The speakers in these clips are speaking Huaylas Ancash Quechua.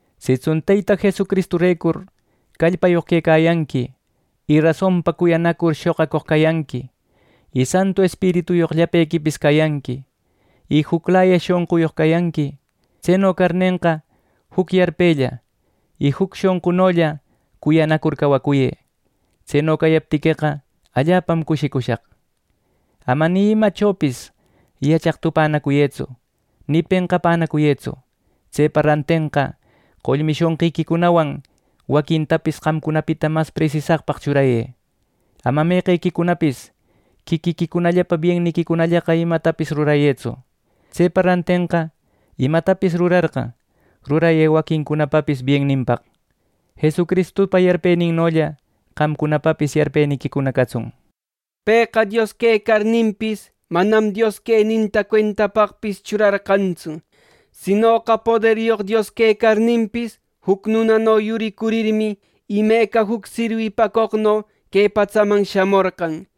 Sitsun Teyta Jesucristurecur qallpayoq quecayanqui, y rasonpa cuyanacur shoqacoq cayanqui, y Santu Espirituyoq llapequipis cayanqui, y juclaya shonquyoq cayanqui; tseno carnenqa, juc yarpella y juc shonqunolla cuyanacur cawacuyë. Tseno cayaptiqueqa, allapam cushicushaq. Ama ni imachopis yachaq tupänacuyëtsu, ni penqapänacuyëtsu. Tsepa rantenqa, qollmi shonqiquicunawan waquintapis qamcunapita mas presisaqpaq churayë. Ama meqequicunapis quiquiquicunapa bienniquicunallaqa imatapis rurayëtsu. Tsepa rantenqa imatapis rurarqa, rurayë waquincunapapis bienninpaq. Jesucristupa yarpeninnolla qamcunapapis yarpeniquicuna catsun. Pëqa Dios quecarninpis, manam Dios queninta cuentapaqpis churarqantsu, Sinoqa poderyoq Dios quecarninpis, juc nunano yuricurninmi, imeca juc sirwipacoqno que patsaman shamorqan.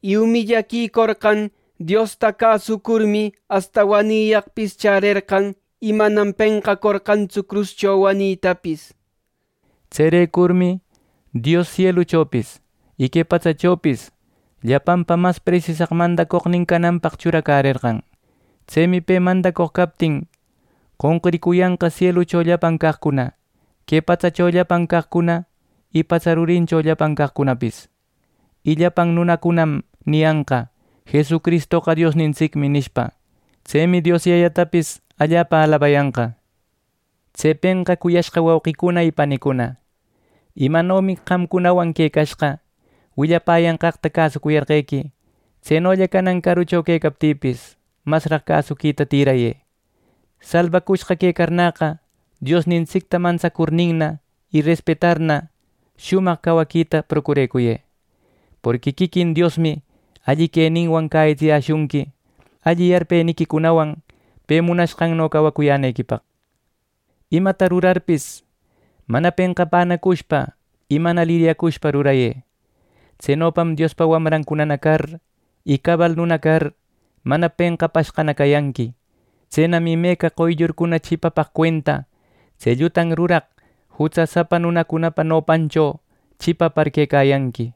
Y umillaquicorqan Diosta cäsucurmi asta waniyaqpis chärerqan, y manam penqacorqantsu cruscho wanitapis. Tserecurmi Dios sieluchopis y que patsachopis llapanpa mas presisaq mandacoqnin cananpaq churarerqan. Tsemi pe mandacoq captin qonquricuyanqa sielucho llapan caqcuna, que patsacho llapan caqcuna y patsa rurincho llapan caqcunapis. Y llapan nunacunam niyanqa: “Jesucristoqa Diosnintsicmi” nishpa. Tsemi Dios Yayatapis allapa alabayanqa. Tsepenqa cuyashqa wauqicuna y panicuna, imanomi qamcunawan quecashqa willapäyanqaqta cäsucuyarqequi; tsenolla canan carucho quecaptïpis, masraq cäsuquita tïrayë. Salbacushqa quecarnäqa, Diosnintsicta mantsacurninna y respetarninna shumaq cawaquita procurecuyë. Porqui quiquin Diosmi alli queninwan cäyitsiyäshunqui, alli yarpeniquicunawan pe munanqanno cawacuyänequipaq. Imata rurarpis, mana penqapänacushpa y mana liryacushpa rurayë. Tsenopam Diospa wamrancuna car, y cabal nuna car, mana penqapashqana cayanqui. Tsenam imeca qoyllurcuna chipapaq cuenta tse llutan ruraq, jutsasapa nunacunapa nopancho chipapar quecayanqui.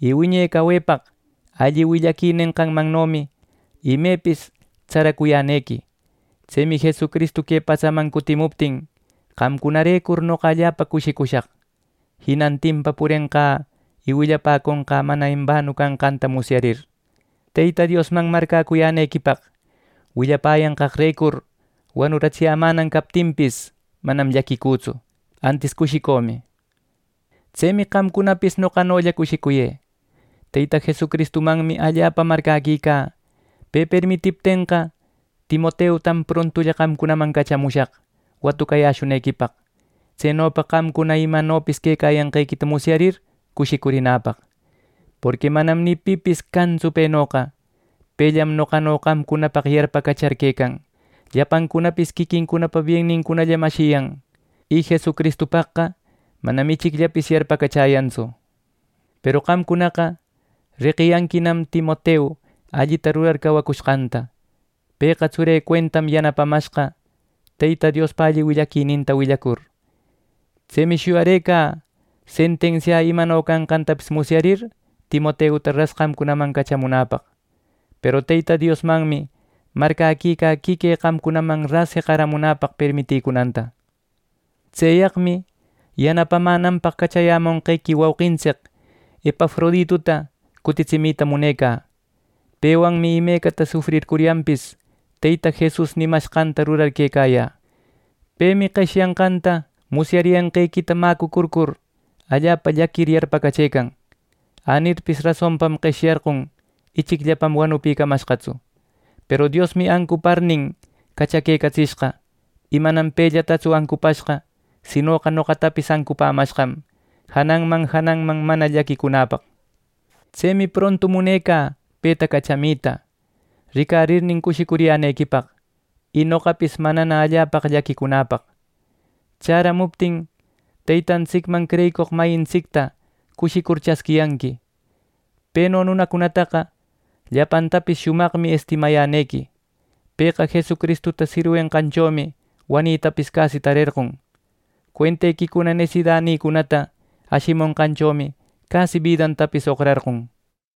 Y wiñe cawepaq alli willaqui nenqanmannomi imepis tsaracuyänequi. Tsemi Jesucristu que patsaman cutimuptin qamcunarecur noqa allapa cushicushaq, jinantinpa purenqä, y willapäconqä mana embanu canqanta musyarir. Teyta Diosman marcäcuyänequipaq willapäyanqaqrecur wanuratsiyämänan captinpis, manam llaquicütsu, antis cushicümi. Tsemi qamcunapis noqanolla cushicuyë. Teyta Jesucristumanmi allapa marcäquicä. Pe permitiptenqa, Timoteutam prontulla qamcunaman cachamushaq watucayäshunequipaq, tsenopa qamcuna imanopis quecayanqequita musyarir cushicurinäpaq. Porqui manam ni pipis cantsu penoqa. Pellam noqano qamcunapaq yarpacachar quecan. Llapancunapis quiquincunapa biennincunallam ashiyan, y Jesucristupaqqa manam ichicllapis yarpacachäyantsu. Peru qamcunaqa reqiyanquinam Timoteu allita rurar cawacushqanta. Pëqa tsurï cuentam yanapamashqa Teyta Diospa alli willaquininta willacur. Tsemi shuyarëcä ˻sentensiä˼ imano canqantapis musyarir Timoteuta ras qamcunaman cachamunäpaq. Peru Teyta Diosmanmi marcäquicä quiquï qamcunaman ras jeqaramunäpaq permiticunanta. Tseyaqmi yanapamänanpaq cachayämonqequi wauqintsic Epafrodituta cutitsimita munecä. Pewanmi imecata sufrircuryanpis Teyta Jesus nimashqanta rurar quecayä. Pemi qeshyanqanta musyariyanqequita mäcupacurir, allapa llaquicur yarpacachëcan. Änirpis rasonpam qeshyallarqon ichicllapam wanupïcamashqatsu. Peru Diosmi ancuparnin cachaquecatsishqa, y manam pellatatsu ancupashqa, sinoqa noqatapis ancupämashqam, jananman jananman mana llaquicunäpaq. Tsemi prontu munecä peta cachamita, ricarirnin cushicuriyänequipaq, y noqapis manana allapaqa llaquicunäpaq. Chäramuptin Teytantsicman creyicoq mayintsicta cushicur chasquiyanqui. Peno nunacunataqa llapantapis shumaqmi estimayänequi. Pëqa Jesucristuta sirwenqanchomi wanitapis casi tarerqon. Cuentequicuna nesidanïcunata ashimonqanchomi casi bidantapis oqrarqon.